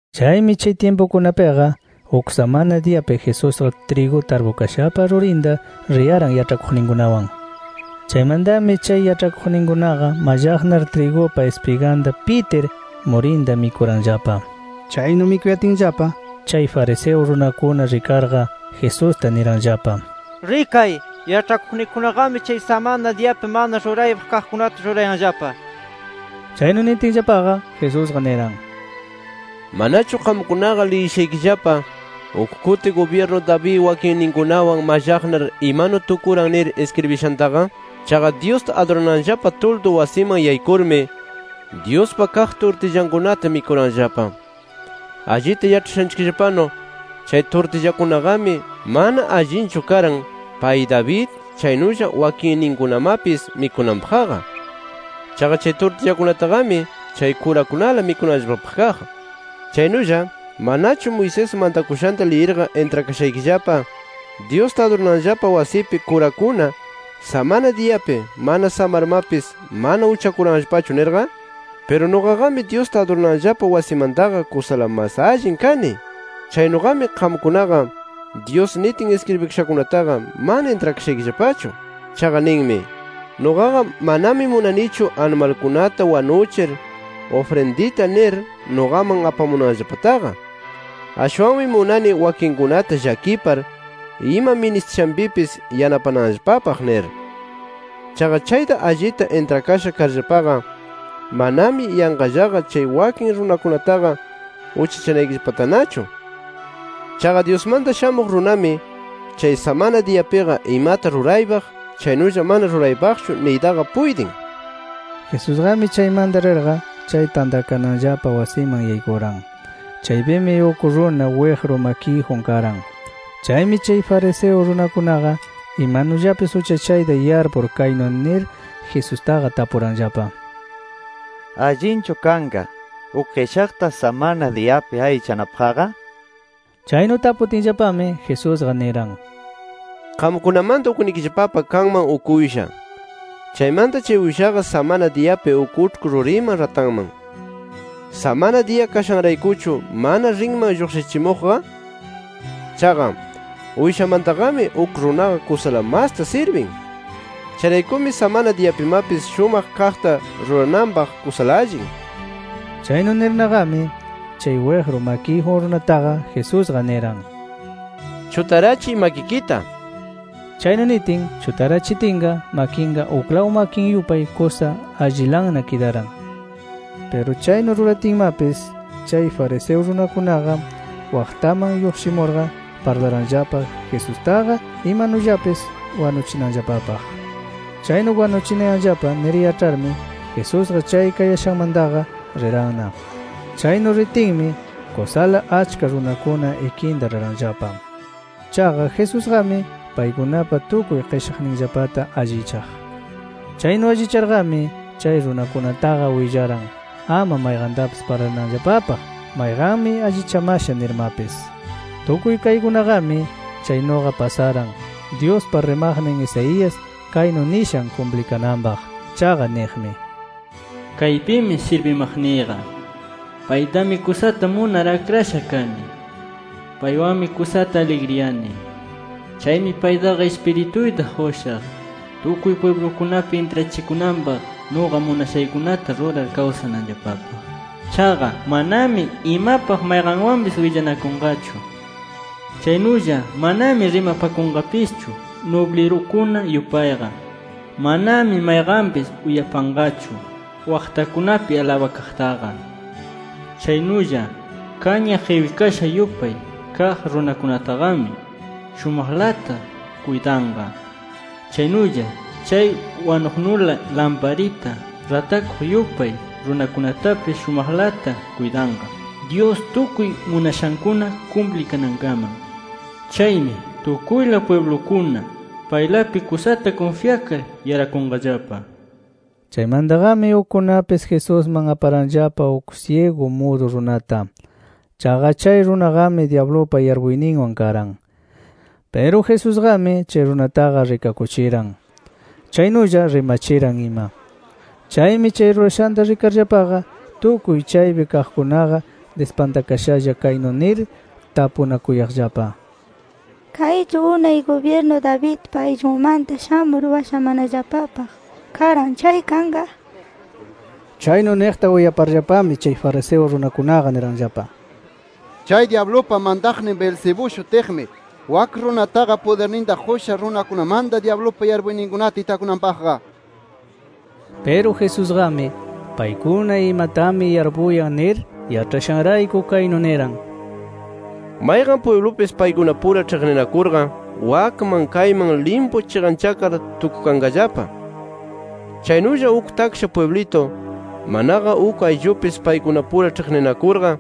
Chaymi chay tyimpukunapiqa, uk samana diyapi Jesusqa trigu tarpukashapa rurinta riyaran yaĉhakuqninkunawan. Chaymantami chay, yaĉhakuqninkunaqa mallaqnar, trigupa ispiganta pitir murinta mikuranllapa. Chaynu mikuyatinllapa chay fariseo runakuna rikarqa, Jesusta niranllapa: —Rikay, yaĉhakuqnikikunaqami chay samana diyapi mana ruraypaq kaqkunata rurayanllapa nir. Chaynu nitinllapaqa, Jesusqa niran: —¿Manachu qamkunaqa liyishaykillapa, uk kuti gubyirnu David wakinninkunawan mallaqnar imanu tukuran nir iskribikashantaqa? Chaqa Dyusta adurananllapa tuldu wasiman yaykurmi Dyuspa kaq turtillankunata mikuranllapa. Allita yaĉhashanchikllapanu, chay turtillakunaqami, mana allinchu karan pay David chaynulla wakinninkunamapis mikunanpaqqa. Chaqa chay turtillakunataqami chay kurakunala mikunanllapapaq kaq. Chaynulla, ¿manachu Moisés mantakushanta liyirqa intrakashaykillapa, Dyusta adurananllapa wasipi kurakuna samana diyapi, mana samarmapis mana uchakuranllapachu nirqa? Piru nuqaqami Dyusta adurananllapa wasimantaqa kusala mas allin kani. Chaynuqami qamkunaqa Dyus nitin iskribikashankunataqa mana intrakashaykillapachu. Chaqa ninmi: ‘Nuqaqa manami munanichu animalkunata wanuchir ufrindita nir nuqaman apamunanllapataqa. Ashwanmi munani wakinkunata llakipar ima ministishanpipis yanapananllapapaq’ nir. Chaqa chayta allita intrakasha karllapaqa manami yanqallaqa chay wakin runakunataqa uchachanaykillapatanachu. Chaqa Dyusmanta Shamuq Runami chay samana diyapiqa imata ruraypaq chaynulla mana ruraypaqchu niytaqa puytin. Jesusqami chaymanta rirqa, chay tantakananllapa wasiman yaykuran. Chaypimi uk runa wiqru makiyjun karan. Chaymi chay fariseo runakunaqa imanullapis uchachayta yarpur kaynu nir Jesustaqa tapuranllapa: —¿Allinchu kanqa uk qishaqta samana diyapi allichanapaqqa? nir. Chaynu taputinllapami Jesusqa niran: —Qamkunamanta uknikillapapa kanman uk uysha. Chaymanta chay uyshaqa samana diyapi uk uĉhku ruriman ratanman. ¿Samana diya kashanraykuchu mana rinman lluqshichimuqqa? Chaqa, ¡uyshamantaqami uk runaqa kusala masta sirbin! Chayraykumi samana diyapimapis shumaq kaqta rurananpaq kusala allin. Chaynu nirnaqami, chay wiqru makiyjun runataqa Jesusqa niran: —Chutarachiy makikita nir. Chaynu nitin, chutarachitinqa makinqa uklaw makin yupay kusa allilanna kidaran. Piru, chaynu ruratinmapis, chay fariseo runakunaqa waqtaman lluqshimurqa parlaranllapa Jesustaqa imanullapis wanuchinanllapapaq. Chaynu wanuchinayanllapa nir yaĉharmi Jesusqa chay kayashanmantaqa riranna. Chaynu ritinmi kusala achka runakuna ikinta riranllapa. Chaqa Jesusqami paykunapa tukuy qishaqninllapata allichaq. Chaynu allicharqami, chay runakunataqa willaran, ama mayqantapis parlananllapapaq mayqanmi allichamasha nirmapis. Tukuy kaykunaqami chaynuqa pasaran Dyuspa rimaqnin Isaías kaynu nishan kumplikananpaq. Chaqa niqmi: “Kaypimi sirbimaqniyqa. Paytami kusata munar akrasha kani. Paywanmi kusata aligriyani. Chaymi paytaqa Ispirituyta qushaq, tukuy pwiblukunapi intrachikunanpaq nuqa munashaykunata rurar kawsananllapapaq. Chaqa manami imapaq mayqanwanpis willanakunqachu. Chaynulla manami rimapakunqapischu nublirukuna yupayqa. Manami mayqanpis uyapanqachu waqtakunapi alabakaqtaqa. Chaynulla kaña qiwikasha yupay kaq runakunataqami shumaqlata kuytanqa. Chaynulla chay wanuqnula lamparita ratakuq yupay runakunatapis shumaqlata kuytanqa, Dyus tukuy munashankuna kumplikanankaman. Chaymi tukuyla pwiblukuna, paylapi kusata kunfyakar yarakunqallapa”. Chaymantaqami ukkunapis Jesusman aparanllapa uk syigu mudu runata. Chaqa chay runaqami dyablupa yarpuyninwan karan. Piru Jesusqami chay runataqa rikakuchiran, chaynulla rimachiran ima. Chaymi chay rurashanta rikarllapaqa tukuy chaypi kaqkunaqa dispantakashalla kaynu nir tapunakuyaqllapa: “¿Kaychu unay gubyirnu Davidpa ayllunmanta shamur washamanallapapaq karan chay kanqa?” nir. Chaynu niqta uyaparllapami chay fariseo runakunaqa niranllapa: “Chay dyablupa mantaqnin Beelzebú shutiqmi, wak runataqa pudirninta qusha runakunamanta dyablupa yarpuyninkunata itakunanpaqqa” nir. Piru Jesusqami, paykuna imatami yarpuyan nir yaĉhashanrayku kaynu niran: “Mayqan pwiblupis paykunapura ĉhiqninakurqa wakman kayman limpu chiqanchakar tukukanllapa. Chaynulla uk taksha pwiblitu, manaqa uk ayllupis paykunapura ĉhiqninakurqa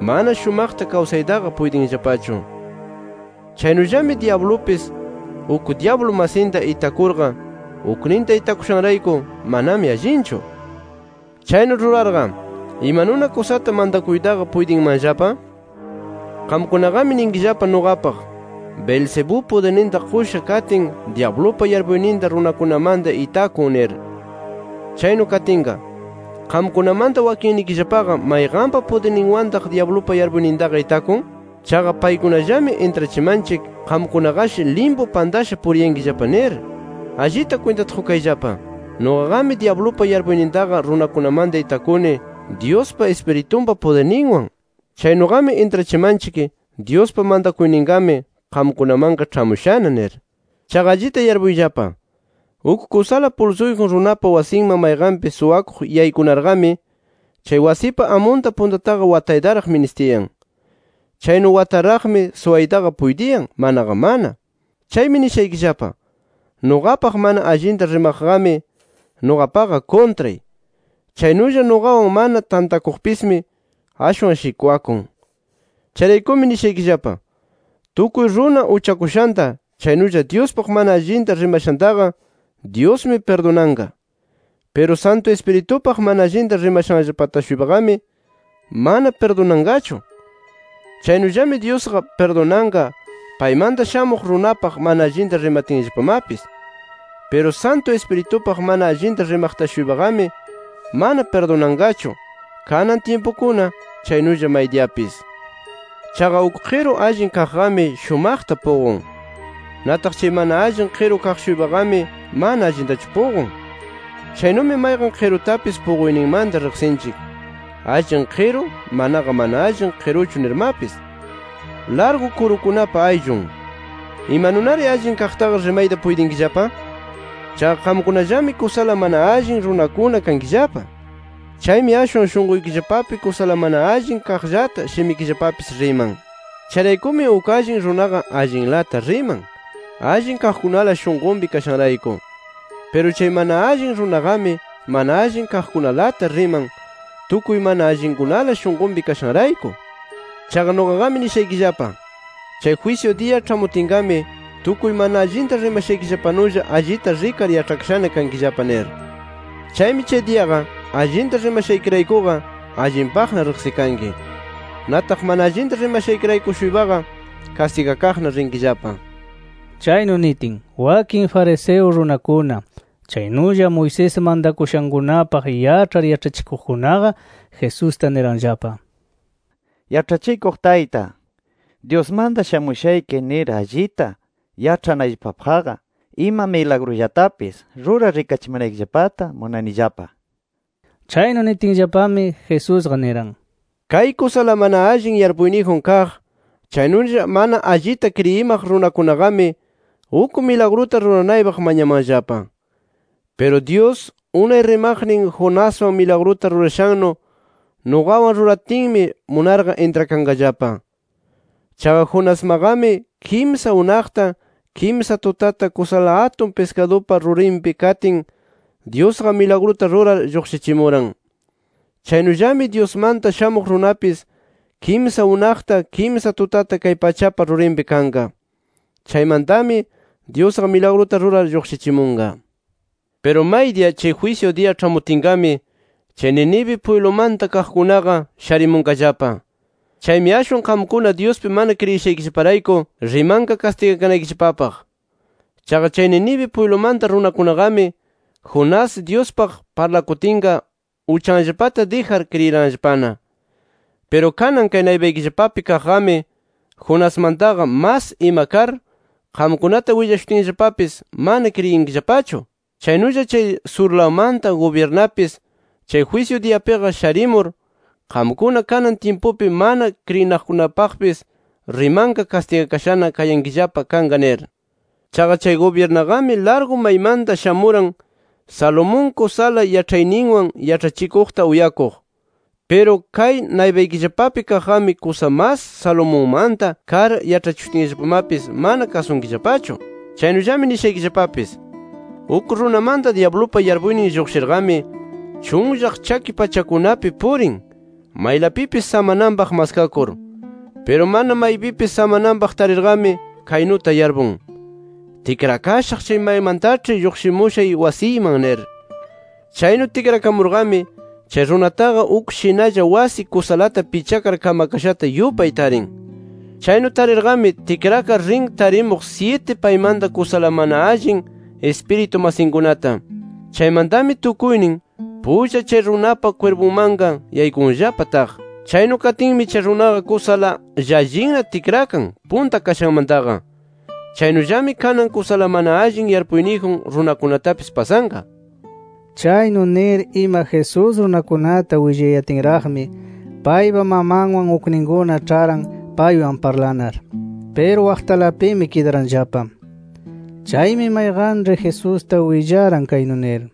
mana shumaqta kawsaytaqa puytinllapachu. Chaynullami dyablupis, uk dyablu masinta itakurqa, ukninta itakushanrayku manami allinchu. Chaynu rurarqa, ¿imanuna kusata mantakuytaqa puytinmanllapa? “Qamkunaqami ninkillapa nuqapaq, ‘Beelzebú pudirninta qusha katin dyablupa yarpuyninta runakunamanta itakun’ nir. Chaynu katinqa, ¿qamkunamanta wakinnikillapaqa mayqanpa pudirninwantaq dyablupa yarpuynintaqa itakun? Chaqa paykunallami intrachimanchik qamkunaqashi limpu pantasha puriyankillapa nir. “Allita kwintata qukayllapa: Nuqaqami dyablupa yarpuynintaqa runakunamanta itakuni Dyuspa Ispiritunpa pudirninwan. Chaynuqami intrachimanchik, Dyuspa mantakuyninqami qamkunamanqa ĉhamushana nir. Chaqa allita yarpuyllapa: Uk kusala pulsuyjun runapa wasinman mayqanpis suwakuq yaykunarqami, chay wasipa amunta puntataqa wataytaraq ministiyan. Chaynu wataraqmi suwaytaqa puytiyan, manaqa mana. “Chaymi nishaykillapa: Nuqapaq mana allinta rimaqqami nuqapaqa kuntray. Chaynulla nuqawan mana tantakuqpismi ashwan shikwakun. “Chayraykumi nishaykillapa: Tukuy runa uchakushanta chaynulla Dyuspaq mana allinta rimashantaqa Dyusmi pirdunanqa. Piru Santu Ispiritupaq mana allinta rimashanllapata-shuypaqami mana pirdunanqachu. Chaynullami Dyusqa pirdunanqa paymanta Shamuq Runapaq mana allinta rimatinllapamapis. Piru Santu Ispiritupaq mana allinta rimaqta-shuypaqami mana pirdunanqachu kanan tyimpukuna chaynulla maydiyapis. “Chaqa uk qiru allin kaqqami shumaqta puqun. Nataq chay mana allin qiru kaq-shuypaqami mana allintachu puqun. Chaynumi mayqan qirutapis puquyninmanta riqsinchik allin qiru, manaqa mana allin qiruchu nirmapis. ¡Largu kurukunapa ayllun! ¿Imanunari allin kaqtaqa rimayta puytinkillapa? Chaqa qamkunallami kusala mana allin runakuna kankillapa. Chaymi ashwan shunquykillapapi kusala mana allin kaqllata shimikillapapis riman. “Chayraykumi uk allin runaqa allinlata riman, allin kaqkunala shunqunpi kashanrayku. Piru chay mana allin runaqami mana allin kaqkunalata riman, tukuy mana allinkunala shunqunpi kashanrayku. Chaqa nuqaqami nishaykillapa: Chay jwisyu diya ĉhamutinqami tukuy mana allinta rimashaykillapanulla allita rikar yaĉhakashana kankillapa nir. Chaymi chay diyaqa, allinta rimashaykiraykuqa allinpaqna riqsikanki. Nataq mana allinta rimashaykirayku-shuypaqa kastigakaqna rinkillapa”. Chaynu nitin wakin fariseo runakuna, chaynulla Moisés mantakushankunapaq yaĉhar yaĉhachikuqkunaqa, Jesusta niranllapa: —Yaĉhachikuq Tayta, Dyusmanta shamushayki nir allita yaĉhanayllapapaqqa ima milagrullatapis rurar rikachimanaykillapata munanillapa nir. Chaynu nitinllapami, Jesusqa niran: “Kay kusala mana allin yarpuyniyjun kaq, chaynulla mana allita kriyimaq runakunaqami uk milagruta ruranaypaq mañamanllapa. Piru Dyus, unay rimaqnin Jonaswan milagruta rurashannu nuqawan ruratinmi, munarqa intrakanqallapa. Chaqa Jonasmaqami kimsa unaqta, kimsa tutata kusala atun piskadupa rurinpi katin, Dyusqa milagruta rurar lluqshichimuran, chaynullami Dyusmanta Shamuq Runapis kimsa unaqta, kimsa tutata kay pachapa rurinpi kanqa. Chaymantami Dyusqa milagruta rurar lluqshichimunqa. “Piru maydiya chay jwisyu diya ĉhamutinqami chay Nínive pwiblumanta kaqkunaqa sharimunqallapa. Chaymi ashwan qamkuna Dyuspi mana kriyishaykillaparayku rimanqa kastigakanaykillapapaq. Chaqa chay Nínive pwiblumanta runakunaqami, Jonás Dyuspaq parlakutinqa, uchanllapata dijar kriyiranllapana. Piru kanan kay naypaykillapapi kaqqami Jonasmantaqa mas ima kar, qamkunata willashutinllapapis mana kriyinkillapachu. “Chaynulla chay surlawmanta gubyirnapis chay jwisyu diyapiqa sharimur, qamkuna kanan tyimpupi mana kriyinaqkunapaqpis rimanqa, kastigakashana kayankillapa kanqa nir. Chaqa chay gubyirnaqami largu maymanta shamuran, Salomón kusala yaĉhayninwan yaĉhachikuqta uyakuq. Piru kay naypaykillapapi kaqqami kusa mas Salomonmanta kar yaĉhachishutinllapamapis, mana kasunkillapachu. “Chaynullami nishaykillapapis: Uk runamanta dyablupa yarpuynin lluqshirqami, chunllaq chaki pachakunapi purin, maylapipis samananpaq maskakur. Piru mana maypipis samananpaq tarirqami, kaynuta yarpun: Tikrakashaq chay maymantaĉhi lluqshimushay wasiyman nir. Chaynu tikrakamurqami, chay runataqa uk shinalla wasi kusalata pichakar kamakashata yupay tarin. Chaynu tarirqami tikrakar rin tarimuq syiti paymanta kusala mana allin ispiritu masinkunata. Chaymantami tukuynin pulla chay runapa kwirpunmanqa yaykunllapa taq. Chaynu katinmi chay runaqa kusala llallinna tikran, punta kashanmantaqa. Chaynullami kanan, kusala mana allin yarpuyniyjun runakunatapis pasanqa”. Chaynu nir ima Jesús runakunata willayatinraqmi, paypa mamanwan, ukninkuna ĉharan paywan parlanar. Piru waqtalapimi kidaranllapa. Chaymi mayqanĉhi Jesusta willaran, kaynu nir: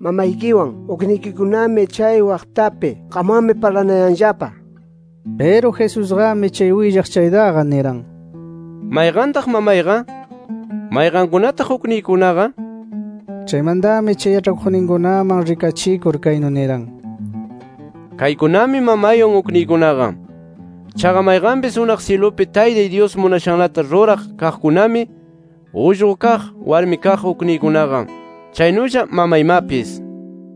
—Mamaykiwan, uknikikunami chay waqtapi. Qamwanmi parlanayanllapa nir. Piru Jesusqami chay willaq chaytaqa niran: —¿Mayqantaq mamayqa? ¿Mayqankunataq ukniykunaqa? nir. Chaymantami chay yaĉhakuqninkunaman rikachikur kaynu niran: —Kaykunami mamaywan, ukniykunaqa. Chaqa mayqanpis unaq syilupi Taytay Dyus munashanlata ruraq kaqkunami, ullqu kaq, warmi kaq ukniykunaqa, chaynulla mamaymapis nir.